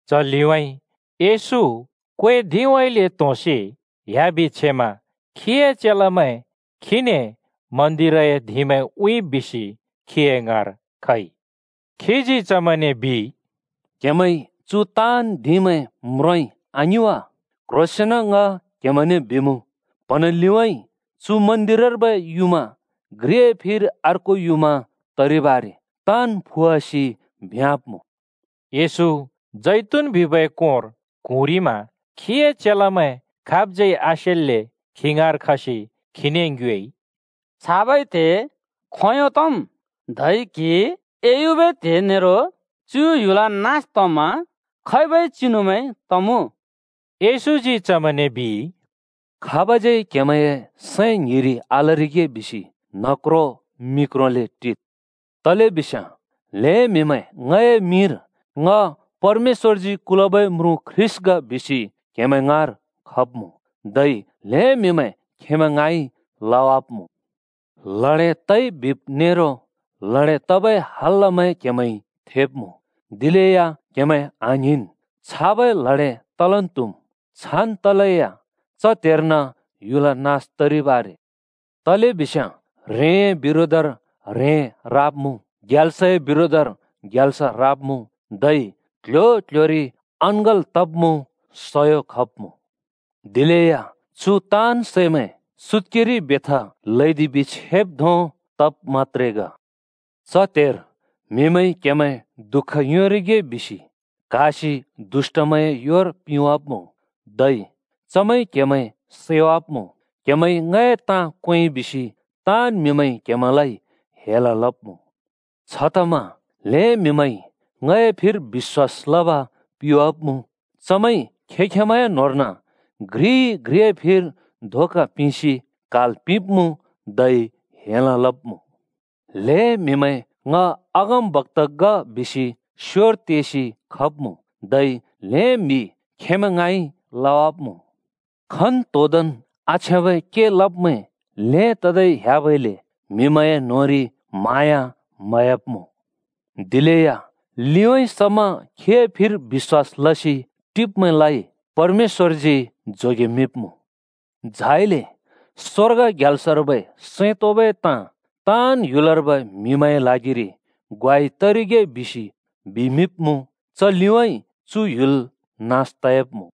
च लिउँइँ येशू क्वै धिउँइँले त्होंसि ह्‍याबि छेमा खीए चेलामैं खीने मन्दिरए धिंमैं उँइँब् बिसि खीए ङाँर खइ। खीजी चमैंने बिइ, “क्हेमैंइ चु ताँन् धिंमैं म्रोंइ, आङि वा? क्ह्रोंसेंन ङ क्हेमैंने बिमुँ, प्‍हँना लिउँइँ चु मन्दिरर्बै युँमा घ्रिए फिर अर्को युँमा तरिब् आरे। ताँन् फुवासि भ्योंवाब्मुँ।” येशू जैतून बिबै कोंर क्हुँरिमा खीए चेलामैं खाबज्यै आसेल्‍ले खी ङाँर खसि खीने ङ्योएइ, “छाबै त्हे खोंयों तम्? धै क्‍हि एयुबै त्हे नेरो चु ह्‍युल नास तमा खैबै चिनुमैं तमुँ?” येशूजी चमैंने बिइ, “खाबज्यै क्हेमैंए सैं ङ्हिरि आलरिगे बिसि न्हक्रो मिक्रोले टिद्। तलेबिस्याँ ल्‍हें म्‍हिमैं ङए मिंरि ‘ङ परमेश्‍वरजी कुलबै म्रुँ ख्रीष्‍ट ग’ बिसि क्‍हेमैं ङाँर खब्मुँ, धै ल्‍हें म्‍हिमैं खेंमैं ङाँइ लवाब्‍मुँ। लडे तइ बिब् नेरो लडे तबै हल्‍लामैं क्‍हेमैंइ थेब्मुँ। दिलेया क्‍हेमैं आङ्हिंन्, छाबै लडे तलन् त्‍हुम्। छान् तलेया च त्हेर्न ह्‍युल नास तरिब् आरे। तलेबिस्याँ ह्रेंए बिरोधर ह्रें राब्मुँ ग्याल्सए बिरोधर ग्याल्स राब्मुँ, धै क्ल्ह्‍यो-क्ल्ह्‍योरि अँङ्गल तब्मुँ, सयो खब्मुँ। दिलेया चु ताँन् सैमैं सुत्‍केरि बेथा ल्हैदिबि छेब् धों तब् मत्‍त्रे ग। “च त्हेर म्‍हिमैंइ क्‍हेमैं दुःख योंरिगे बिसि क्‍हासि दुष्‍टमैंए योर पिंवाब्मुँ, धै चमैंइ क्‍हेमैं सैवाब्‍मुँ। क्‍हेमैंइ ङए ताँ क्वेंइ बिसि ताँन् म्हिमैंइ क्‍हेमैंलाइ हेल लब्‍मुँ। छतमा ल्‍हें म्‍हिमैंइ ङए फिर बिश्‍वास लब पिवाब्‍मुँ। चमैंइ खें-खेंमैंए न्‍होंर्न घ्रिइ-घ्रिए फिर धोका पिंसि क्हाल् पिंब्मुँ, धै हेल लुब्मुँ। ल्‍हें म्‍हिमैं ‘ङ अगमबक्‍ता ग’ बिसि स्योर तेसि खब्‍मुँ, धै ल्हें म्हि खेंमैं ङाँइ लवाब्मुँ। खन्‍तोंदोंन् आछ्याँबै के लब्मैं ल्‍हें ततै ह्‍याबइले म्‍हिमैंए न्‍होंरि म्हाँया म्‍हयाब्‍मुँ। दिलेया लिउँइँ समा खीए फिर बिश्‍वास लसि टिब्मैंलाइ परमेश्‍वरजी जोगेमिंब्मुँ। झाइले स्‍वर्ग ग्याल्सर्बै सैं तोंबै ताँ ताँन् ह्‍युलर्बै ह्रेंमैंए ल्हागिरि ग्वाइ तरिगे बिसि बिमिंब्मुँ, च लिउँइँ चु ह्‍युल नास तयाब्मुँ।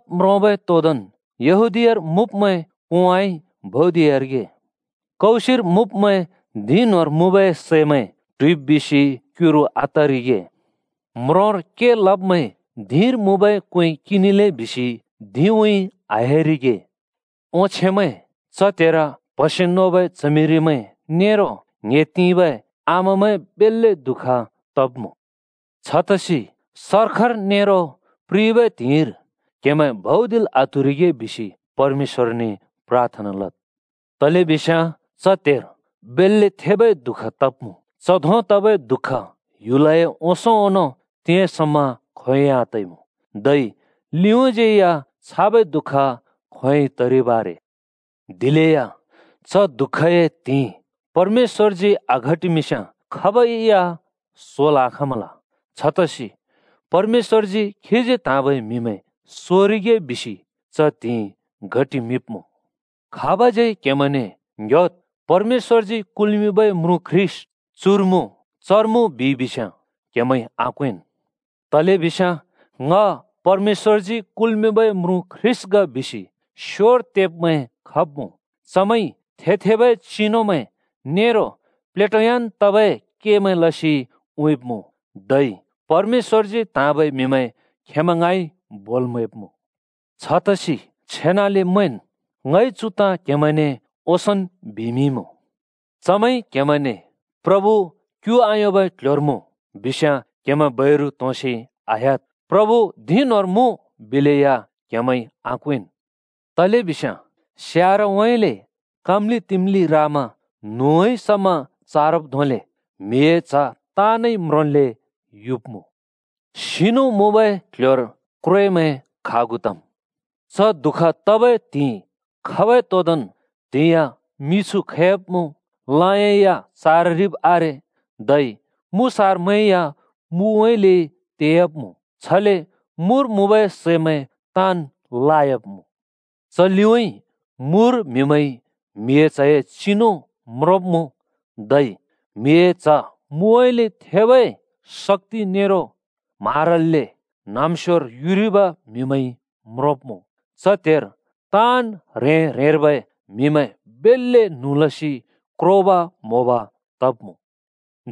छ तब् म्रोंबै तोदोंन् यहूदीयार मुँब्मैं कोंउँइँ भौदिरिगे। कौसिर मुँब्‍मैं धिं न्‍होंर मुँबै सैमैं ट्हुइब् बिसि क्युरु आतरिगे। म्रोंर के लब्‍मैं धिंर मुँबै क्‍वें किंनिले बिसि धिंउँइँ आह्‍यारिगे। ओंछेमैं! च त्हेर प्‍हसे नोबै च्हमिरिमैं नेरो ङ्‍हे तिंबै आमामैं बेल्‍ले दुःख तब्‍मुँ। छतसि सर्खर नेरो प्रिबै त्हिंइर क्हेमैं भौदिल् आत्हुरिगे बिसि परमेश्‍वरने प्राथना लद्। तलेबिस्याँ च त्हेर बेल्‍ले थेबै दुःख तब्‍मुँ। च धों तबै दुःख ह्‍युलए ओंसों ओंनों तिंयाँ समा खोंयोंइ आतइमुँ, धै लिउँज्यै या छाबै दुःख खोंयोंइ तरिब् आरे। दिलेया च दुःखए त्हिंइ परमेश्‍वरजी आघटिमिंस्याँ खाबै या सोल् आखाँमल। छतसि परमेश्‍वरजी खीजी त्हाँबै म्‍हिमैं सोरिगे बिसि च त्हिंइ घटिमिंब्मुँ। “खाबज्‍यै क्‍हेमैंने ‘ङ्‍ह‍योद्, परमेश्‍वरजी कुल्‍मिंबै म्रुँ ख्रीष्‍ट चुर मुँ,’ ‘चर मुँ,’ बिइ बिस्याँ क्हेमैंइ आक्‍वेंन्। तलेबिस्याँ ‘ङ परमेश्‍वरजी कुल्मिंबै म्रुँ ख्रीष्‍ट ग’ बिसि स्‍योर तेब्मैं खब्मुँ। चमैंइ थे-थेबै चिनुमैं नेरो प्लेटोयान् तबै केमैं लसि उँइँब्मुँ, धै परमेश्‍वरजी त्हाँबै म्‍हिमैं खेंमैं ङाँइ बोल् म्‍हैब्‍मुँ। छतसि छेनाले मैंन्! ङइ चु ताँ क्‍हेमैंने ओंसोंन् बिमिंइमुँ। “चमैंइ क्‍हेमैंने ‘प्रभु क्यु आयोंबै क्ल्ह्‍योर मुँ!’ बिस्याँ क्‍हेमैं बैरु त्होंसि आह्‍याद्। ‘प्रभु धिं न्‍होंर मुँ’ बिलेया क्‍हेमैंइ आक्‍वेंन्। तलेबिस्याँ स्यारउँइँले (पूर्वउँइँले) काम्‍लि-तिम्‍लि रामा न्हुउँइँ (पश्‍चिम) समा चारब् धोंले म्हिए च्ह ताँनइ म्रोंन्‍ले युब्‍मुँ। “सिनु मुँबै क्‍ल्‍ह्‍योर क्‍व्रेमैं खागु तम्।” “च दुःख तबै त्हिंइ खाँबै तोदोंन् त्‍हिंयाँ मिछु खैयाब्‍मुँ, लयाँ या चाररिब् आरे, धै मुसारमैं या मुउँइँले तेयाब्‍मुँ। छले मुर मुँबै सैमैं ताँन् लायाब्‍मुँ। च लिउँइँ मुर म्हिमैंइ म्हिए च्हए चिनु म्रोंब्मुँ। धै म्हिए च्ह मुउँइँले थेबै शक्‍ति नेरो म्हारल्‍ले न्हाँम्स्योर युरिब म्हिमैंइ म्रोंब्‍मुँ। च त्हेर ताँन् ह्रें-ह्रेंर्बै म्हिमैं बेल्‍ले न्हुँ लसि क्रोब म्होब तब्मुँ।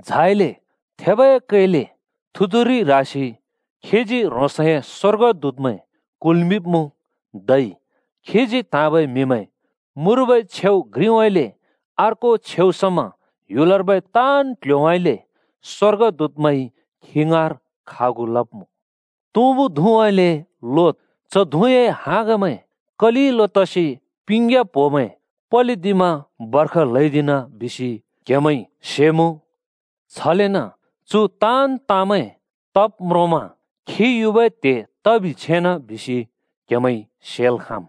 झाइले थेबै कैलै थुतुरि ह्रासि खीजी ह्रोंसए स्‍वर्गदूतमैं कुल्‍मिंब्‍मुँ। धै खीजी त्हाँबै म्हिमैं मुर्बै छेउ घ्रिउँइँले अर्को छेउ समा ह्‍युलर्बै ताँन् क्ल्ह्‍योउँइँले स्‍वर्गदूतमैंइ खी ङाँर खागु लब्मुँ।” “तुँबु धुँउँइँले लोद्। च धुँए हाँगमैं कलिलो तसि पिंग्‍या प्‍होमैं पलिदिमा बर्ख ल्‍हैदिना बिसि क्‍हेमैंइ सेमुँ। छलेन चु ताँन् ताँमैं तब् म्रोंमा खी युबै त्हे तबि छेना बिसि क्‍हेमैंइ सेल् खाँम्।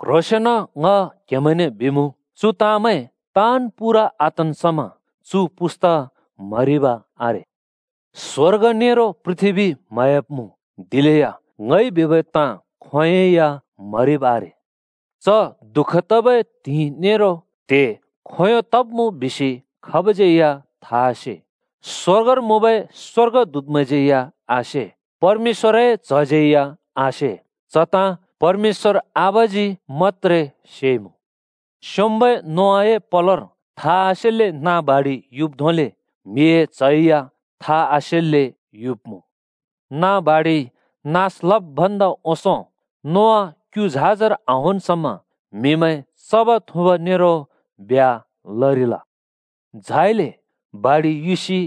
क्ह्रोंसेंन ङ क्हमैंने बिमुँ, चु ताँमैं ताँन् पूरा आतन् समा चु पुस्‍ता म्‍हरिब आरे। स्वर्ग नेरो पृथ्‍बी म्‍हयाब्‍मुँ, दिलेया ङइ बिबै ताँ खोंयोंइ या म्‍हरिब आरे।” “च दुःख तबै त्हिंइ नेरो त्हे खोंयों तब्‍मुँ बिसि खाबज्यै था आसे। स्‍वर्गर मुँबै स्‍वर्गदूतमैंज्यै आसे, परमेश्‍वरए च्‍हज्यै या आसे। च ताँ परमेश्‍वर आबाजी मत्‍त्रे सेइमुँ। स्‍योंम्‍बै नोआए पलोर था आसेल्‍ले नाँ बाढि युब् धोंले म्हिए च्ह या था आसेल्‍ले युब्‍मुँ। नाँ बाढिइ नास लब् भन्दा ओंसों नोआ क्यु झाजर आहोंन् समा, म्‍हिमैं चब थुँब नेरो ब्ह्‍या लरिल। झाइले बाढि युसि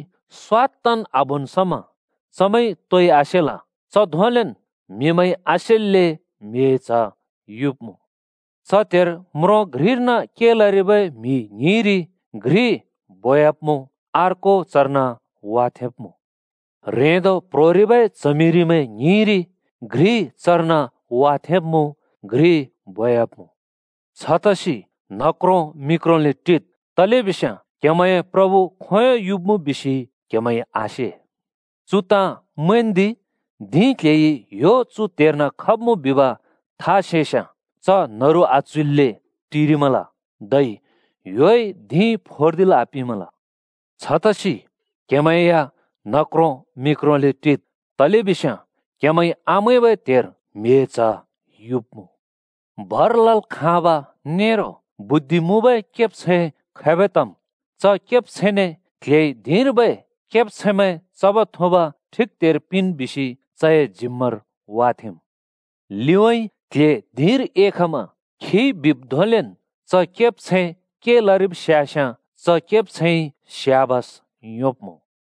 स्वात्तन् आबोन् समा चमैंइ तोइ आसेल। च धोंलेन् म्‍हिमैंइ आसेल्‍ले म्हिए च्ह युब्‍मुँ। च त्हेर म्रों घ्रिर्न के लरिबै म्‍हि ङ्हिंरि घ्रि बोब्‍मुँ, अर्को चर्न वाथेंब्‍मुँ। ह्रेंदो प्‍ह्रोरिबै च्हमिरिमैं ङ्हिंरि घ्रि चर्न वाथेंब्मुँ घ्रि बोब्‍मुँ। “छतसि न्हक्रों-मिक्रोंले टिद्, तलेबिस्याँ क्‍हेमैंए प्रभु खोंयों युब्‍मुँ बिसि क्‍हेमैंइ आसे। चु ताँ मैंन्दि, धिं क्‍ल्‍हेइ ‘ह्‍यो चु त्हेर्न खब्मुँ’ बिब था सेस्‍याँ च न्‍हरु आच्‍हुइल्‍ले टिरिमल, धै ह्‍योइ धिं फोर्दिल् आपिंमल। छतसि क्‍हेमैं या न्हक्रों मिक्रोंले टिद्, तलेबिस्याँ क्‍हेमैंइ आमैंबै त्हेर म्हिए च्ह युब्‍मुँ।” “भर लल् खाँब नेरो बुद्धि मुँबै केब्छैं खैबै तम्? च केब्छैंने क्ल्हेइ ‘धिंर्बै केब्‍छैंमैं चब-थुँब ठिक त्हेर पिंन्’ बिसि चए जिम्‍मार वाथेंम्। लिउँइँ क्ल्हे धिंर एखमा खिइ बिब् धोंलेन् च केब्छैं के लरिब् स्‍यास्याँ च केब्छैंइ स्याबस योंब्मुँ।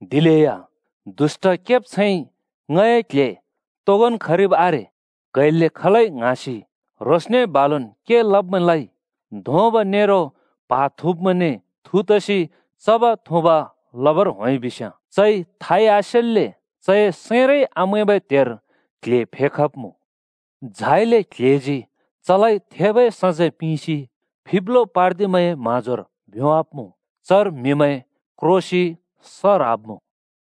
दिलेया दुष्‍ट केब्छैंइ ‘ङए क्ल्हे तोगोंन् खरिब् आरे क्हैल्‍ले खलै’ ङ्हाँसि, ह्रोंसने बालुन् के लब्‍मैंलाइ धोंब नेरो प्हा थुँब्‍मैंने थु तसि चब्-थुँब लबर होंइ बिस्‍याँ, चइ थाइ आसेल्‍ले चए सैंरै आमैंबै त्हेर क्ल्हे फेखब्‍मुँ। झाइले क्ल्हेजी चलाइ थेबै सजैं पिंसि फिब्लो पार्दिब्मैंए म्हाँजोर भ्योंवाब्मुँ। चर म्हिमैं क्रोसि स ह्राब्‍मुँ।”